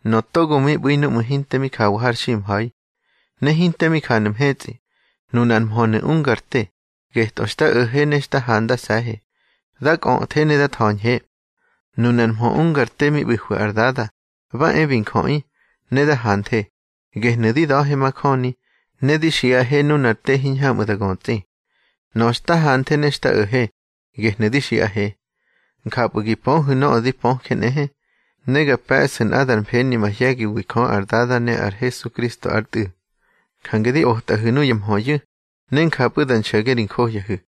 Nöꞌö togo mi ꞌbu̱i núꞌmu̱ hinte mi jawa har ximha̱i, ne hinte mi janu̱ mhetsꞌi, nunar mhönu̱ ungar te, getꞌö xta o̱he ne xta handase̱he, da kꞌöthe ne da tha̱ñhe. Nunar mhö ungar te mi ꞌbu̱hwi ar Dada, ba e bi njöꞌi, ne da hanthe, gehnu̱ di da̱he majöni, ne di xiꞌahe nunar te hiñhamꞌu̱ da götsꞌi. Nöꞌö xta hanthe ne xta o̱he, gehnu̱ di xiꞌahe. Njapꞌu̱ gi pöhu̱ nöꞌö di pöje nꞌehe, ne ga pe̱ꞌsu̱ nꞌadar mfeni mahye̱giwi Jö ar Dada ne ar Hesukristo ár Tꞌu̱. Jange di otꞌaꞌihu̱ nuya mhöyu̱, ne njapꞌu̱ da nxo̱ge ri johyahu̱.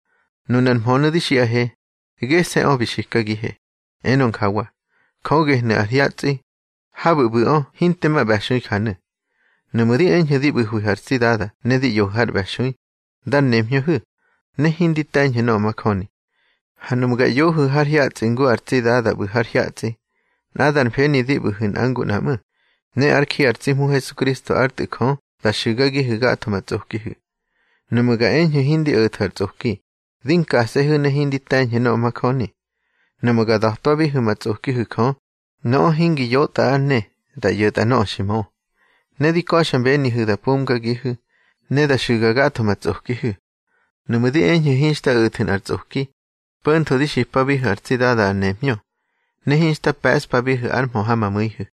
Nunar mhönu̱ di xiꞌahe, gese̱ꞌö bi xikagihe, enö njawa: Jö gehnu̱ ar hyatsꞌi. Habu̱ ꞌbu̱ꞌö hinte ma ꞌbe̱xui janu̱. Nuꞌmu̱ di eñhu̱ di ꞌbu̱hwihu̱ ar tsi Dada ne di ꞌyohu̱ har ꞌbe̱xui, dar nemhñöhu̱, ne hindi te̱ñhu̱ nöꞌö majöni. Ha nuꞌmu̱ ga ꞌyohu̱ har hyatsꞌi ngu ar tsi Dada ꞌbu̱ har hyatsꞌi, nꞌadar mfeni di ꞌbu̱hu̱ nꞌa ngu nꞌa ꞌmu̱, ne ár ji ar tsi Hmu Hesukristo ár Tꞌu̱ Jö da xu̱gagihu̱ gatho ma tsꞌokihu̱. Nuꞌmu̱ ga eñhu̱ hindi o̱thu̱ ar tsꞌoki, di nkase̱hu̱ ne hindi te̱ñhu̱ nöꞌö majöni. Nuꞌmu̱ ga da̱twabihu̱ ma tsꞌokihu̱ Jö, nöꞌö hingi yotꞌa ár ne, da ꞌyo̱tꞌa nöꞌö xi mö. Ne di ka̱xmbenihu̱ da pumgagihu̱, ne da xu̱ga gatho ma tsꞌokihu̱. Nuꞌmu̱ di eñhu̱ hinxta o̱thu̱ nꞌar tsꞌoki, po̱ntho di xipabihu̱ ar tsi Dada ar nemhñö, ne hinxta pe̱ꞌspabihu̱ ár mhö ha ma mu̱ihu̱.